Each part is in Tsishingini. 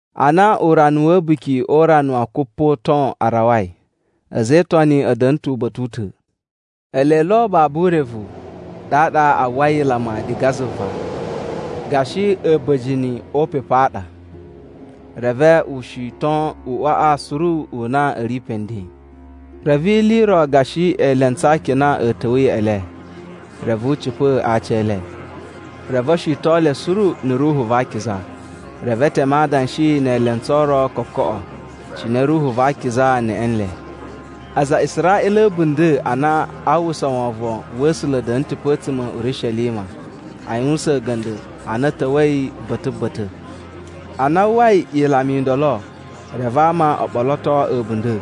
Ana urana wa̱ A̱buki o Urana wa Kupoton a rawai, a̱za̱ e Itoni a̱ da̱na̱ ta̱ uba̱ta̱ u ta̱. Ele lo babu urevu, ɗaɗa a uwwai ilama diga zuva gashi a̱ba̱jini o upepu a ɗa, reve u shiton uꞌwaꞌa suru u na a̱ ri pe nden. Reve ili i ro gashi elentsu a akina a̱ ta̱wa̱ ya̱ꞌa̱ le, reve u cipa̱ a aci e le. Reve o shiton le suru na̱ Ruhu va Akiza. Reve e teme adanshi ne elentsu o ro kokoꞌo, cine Ruhu va Akiza neꞌe nle. Aza a Israꞌila a̱ a̱bunda̱ a na a uwwusa wovon wa̱ A̱sula̱ a̱ da̱na̱ ta̱ pe a̱tsuma̱ a̱ Urishelima a yuwusan a̱ga̱nda̱ a na a̱ ta̱wa̱i ba̱ta̱ ba̱ta̱. Ana a uwwai ilama i ndolo, reve ama o ɓoloto a̱bunda̱.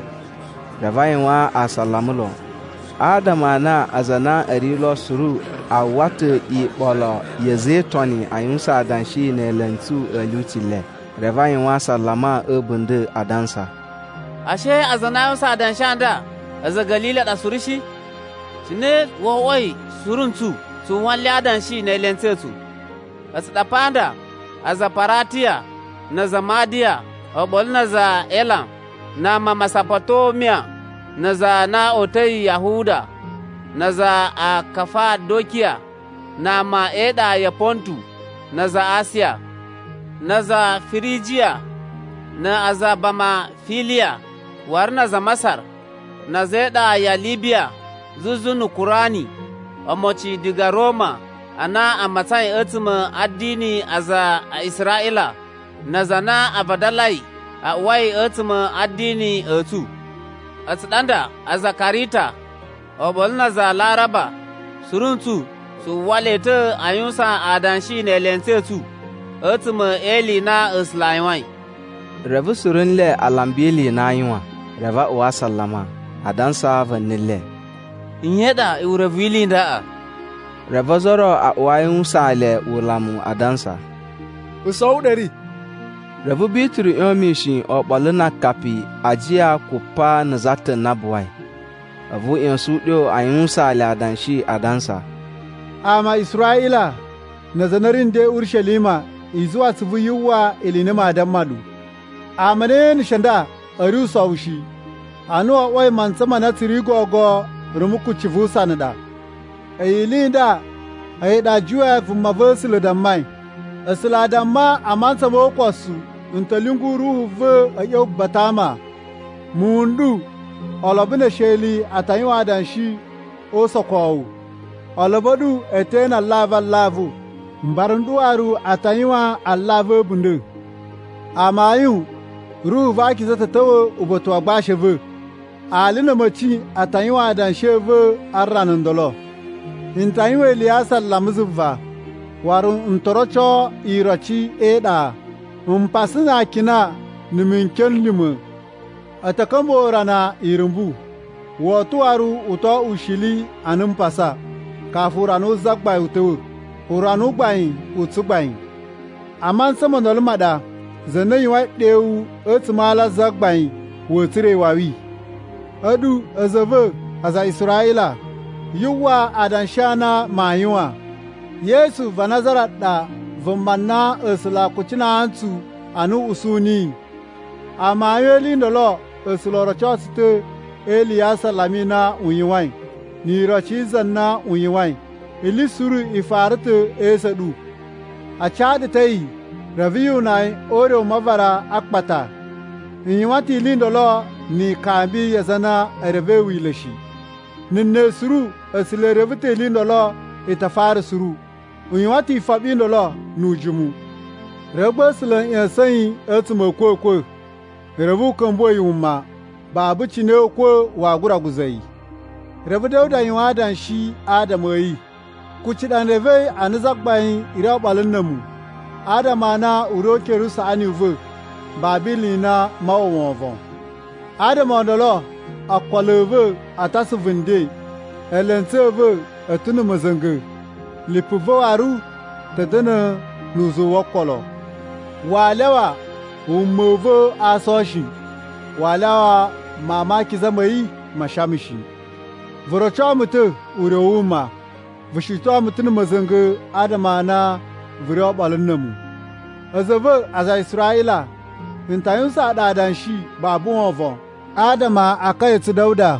Reve a yuwan asalama lon, adama a na aza a na a̱ ri lo suru a uwwa ta̱ iɓolo ya̱ a̱za̱ e Itoni a yuwusan adanshi ne elentsu a̱ lyuci le. Reve a yuwan asalama a̱ a̱bunda̱, adansa, “Ashe aza a na a yuwusan adanshi a nda a̱za̱ a̱ Ga̱lili a ɗa suru shi? Cine wo oꞌwoi suru ntsu tsu uwwa nle a adanshi ne elentsu a̱ tsu? A̱tsu ɗa pa nda aza a Paratiya na aza a Madaya oɓolo na aza a Elam na ama a Masapotomiya na aza a na o uta̱i Yahuda na aza a Kafadokiya na ama e iɗa ya Pontu na aza a Asiya. Na aza a Firijiya na aza a Bamafiliya waru na aza a Masar, na̱ a̱za̱ e iɗa ya Libiya zuzu na̱ Kurani omocin diga Roma a na a matsain a̱tsuma̱ a̱ a̱dini a aza a Israꞌila na aza a na a vadalai a uwai a̱tsuma̱ a̱ a̱dini a̱ tsu. A̱tsu ɗa nda aza a Karita, oɓolo na aza a Laraba suru ntsu tsu uwwa le ta̱ a yuwusan adanshi ne elentsu a̱ tsu a̱tsuma̱ e ili i na A̱sula̱ a yuwain.” Reve suru nle a lamba ili i na aa yuwan, reve a uwa asalama, adansa va̱ni le, “Nye i ɗa urevu wi ili i ndaꞌa?” Reve ozo o ro a uwa a yuwusaan le ulamu adansa, “Usowu u ɗa a̱ ri.” Reve Bituru ꞌyon mishin oɓolo na akapi a ajiya kupa na̱ za ta̱ na buwai, a̱vu u ꞌya̱sa̱n uɗyo a yuwusaan le adanshi, adansa, “Ama a Israꞌila na aza a na a̱ ri nden Urishelima, i zuwa atsuvu yu uwwa ili i na maa damma ɗu. Ama a na ye eneshe nda a̱ ri usowu shi, ana wo oꞌwoi mantsa ma na tsu ri gogo rumu kucci vu usana ɗa. A̱yi ili i nda a̱yi ɗa Juwe vumava̱sula̱ dammai, A̱sula̱ a damma: ‘A mantsa mo ukosu n ta̱ lyungu Ruhu va̱ a̱ ꞌya̱wa̱ ba̱ta̱ a ama. Muwun n ɗu olobo ne esheli a ta yuwan adanshi o usokowu. Olobo a̱ ɗu e te ene alavu alavu. Mbara n ɗu waru a ta yuwan alavu a̱ a̱bunda̱. Amayun Ruhu va Akiza ta̱ ta̱wa̱ uba̱ta̱ wa agbashi a̱ va̱, ali na̱ a̱ma̱ci a ta yuwan adanshi a̱ va̱ a rana ndolo. N ta yuwan ili ya asalama zuva, waru n to roco iroci e iɗa, mpasa na akina na̱ mikyon n lima̱. A̱ ta̱ ka̱mbuwa̱ urana irumbu, woto waru u to oꞌwo ushili ana mpasa kafu urana wu Zagbain u ta̱wa̱, urana u gbain u tsugbain. A mantsa mo ndolo ma ɗa za na yuwain ɗewu a̱tsuma̱ a ala a Zagbain wa̱a̱ tsura̱ iwawi.’ “A̱ɗu a̱za̱ a̱ va̱ aza a Israꞌila, yu uwwa adanshi a na maa yuwan. Yesu va Nazara ɗa vuma na A̱sula̱ a kucinaa ntsu a na u usu niyi. Amayun e ili i ndolo A̱sula̱ o roco tsu ta̱ e ili ya asalama i na u yuwain, ni iroci za na u yuwain. Ili suru i fara ta̱ e esu a̱ ɗu. A ca ɗu ta̱ a̱yi, reve yu una yi o ure u mavara a akpata. I yuwan ta̱ ili i ndolo ni ikambi ya aza a na e revei Wila̱ shi. Na̱ ne suru, A̱sula̱ e reve ta̱ ili i ndolo i ta fara suru. U yuwan ta̱ ifoɓi i ndolo nu ujimu. Reve gba A̱sula̱ a̱ ꞌya̱sa̱n yi a̱tsuma̱ a̱ a̱kwa̱kwa̱, reve u ka̱mbuwa̱ yi wuma. Babu cine ukwa̱ waa gura guza̱ yi. Reve Da̱wuda yuwan adanshi adama a̱ yi, ‘Kuci ɗa n revei a na Zagbain ri oɓolo na̱ a̱mu. Adama a na u ri o ukere usaꞌani u va̱, babu ili i na maa uwwa wovon. Adama o ndolo ookolo a̱ va̱ a̱ ta̱ asuvu nden, eelentsu a̱ va̱ a̱ ta̱ na̱ ma̱za̱nga̱, lipu va̱ waru ta̱ da̱na̱ nu uzuwu wo okolo. Waa lyawa wuma u va̱ a aason shi, waa lyawa Mawun ma Akiza ma̱ yi maa shama shi. Vu roco mu ta̱ ure u wuma. Vu shiton mu ta̱ na̱ ma̱za̱nga̱ adama a na vu ri oɓolo na̱ a̱mu.’ “A̱za̱ a̱ va̱ aza a Israꞌila, n ta yuwusaan ɗu adanshi babu wovon adama a akaya a̱ tsu Da̱wuda.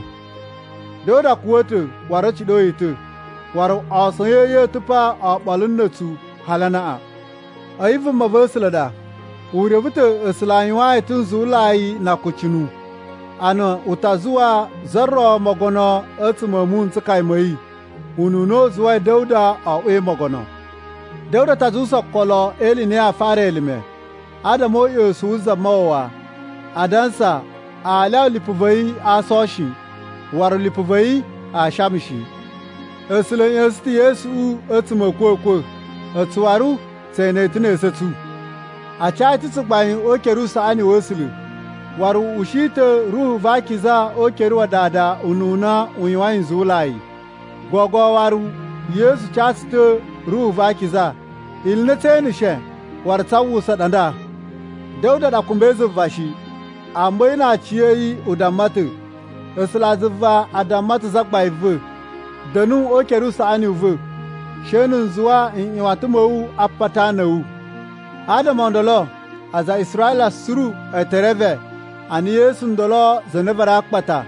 Da̱wuda kuwa̱ ta̱ waru a̱ ciɗo yi ta̱, waru aason a̱ yi a ta̱ pa oɓolo na̱ a̱tsu hali anaꞌan. A̱yi vumava̱sula̱ ɗa, u reve ta̱ A̱sula̱ a yuwaan yi ta̱ nzuwulai na akucunu, a na u ta zuwa za ro mogono a̱tsuma̱ a̱ muwun n tsukaya ma̱ yi, ununa u zuwai Da̱wuda oꞌwoi mogono. Da̱wuda ta zuwusa okolo e ili i na yaa fara elime adama o uꞌyosun wu Zamawawa, adansa, aa lyawa lipu va̱ yi a aason shi, waru lipu va̱ yi aa shama shi. A̱sula̱ a̱ ꞌya̱sa̱n ta̱ Yesuꞌu a̱tsuma̱ a̱ a̱kwa̱kwa̱, a̱tsu waru tse ene ta̱ ne esu a̱ tsu. A ca yi ta̱ tsugbain o ukere usaꞌani wa̱ A̱sula̱, waru u ushi ta̱ Ruhu va Akiza o ukere wa Dada ununa a yuwain nzuwulai. Gogo waru Yesu ca tsu ta̱ Ruhu va Akiza. Ili i na tsee eneshe, waru tsaa uwwusa ɗa nda. Da̱wuda ɗa kumbai zuva shi, amma a̱yi na aciya̱yi u damma ta̱, ‘A̱sulazuva a damma ta̱ Zagbain va̱: “Da̱nu o ukere usaꞌani u va̱, she na̱ n zuwa nꞌyuwatan ma̱ wu a apata a ana a̱ wu.” ’ “Adama o ndolo, aza a Israꞌila suru e te reve a na Yesu ndolo za na a varai a akpata,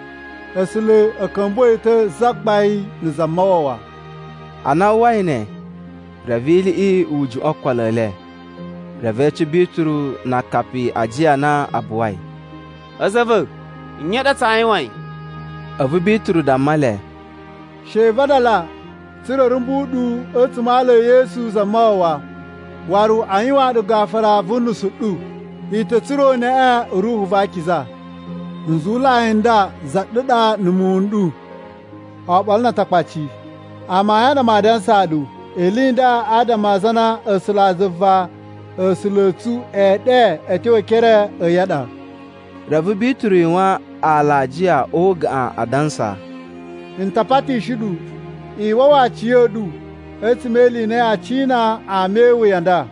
A̱sula̱ a̱ ka̱mbuwa̱ yi ta̱ Zagbain na̱ Zamawawa.” Ana a uwwai ne, reve iliꞌi i juꞌwa̱n okolo e le, reve e ece Bituru na akapi a ajiya a na a buwai, “A̱za̱ a̱ va̱, nye i ɗa tsaa yuwain?” A̱vu Bituru damma le, “She i vadala, tsa̱ra̱ a̱ rumbu ɗu a̱tsuma̱ a ala e Yesu Zamawawa, waru a yuwaan ɗu gafura vu unusu u ɗu. I ta̱ tsura̱ uneꞌe u Ruhu va Akiza. Nzuwulai n nda za ɗu ɗa na̱ muwun n ɗu, oɓolo na Atakpaci. Amayun a ɗa maa dansaa ɗu, ili i nda adama a aza a na A̱sulazuva A̱sula̱ a̱ tsu ee ɗe a̱ tyo e ekere a̱ yi a ɗa.” Reve Bituru yuwan alajiya o ugaꞌan adansa, “N ta patishi ɗu i wawa aciya̱ɗu a̱tsuma̱ e ili i na yaa cina ama e iwuya a nda.”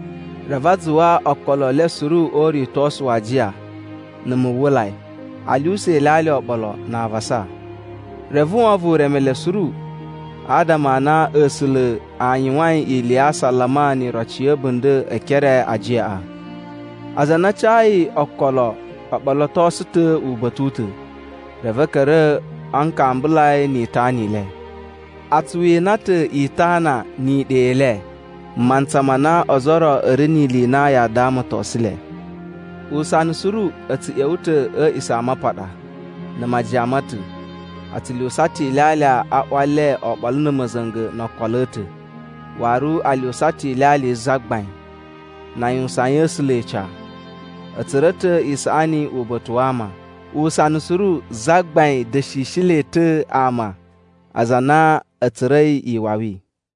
Reve a zuwa okolo e le suru o uritosu wa ajiya na̱ muwwulai, a lyuwusa ilyalya oɓolo, na avasa. Reve wovon u reme le suru, adama a na A̱sula̱ a yuwain ili ya asalama ni iroci ya̱ a̱bunda̱ e ekere ajiyaꞌa. Aza a na a cayi okolo o ɓolotosu ta̱ uba̱ta̱ u ta̱, reve a̱ ka̱ra̱ a nkambulai ni itana i le. A tsu wina ta̱ itana ni iɗa i le, mantsa ma na ozo o ro a̱ ri ni ili i na yaa damatosun le. Usana suru a̱ tsu ꞌya̱wa̱ ta̱ a̱ A̱a̱ꞌisamapaɗa na̱ majiyan ma̱ ta̱. A tsu lyuwusa ta̱ ilyalya a ꞌwa le oɓolo na̱ ma̱za̱nga̱ no okolo a̱ ta̱, waru a lyuwusa ta̱ Ilyalya yi Zagbain, na a yuwusayin A̱sula̱ ica. A̱ tsura̱ ta̱ isaꞌani uba̱ta̱ wa ama. Usana suru Zagbain da̱shishi le ta̱ ama aza a na a̱ tsura̱i iwawi.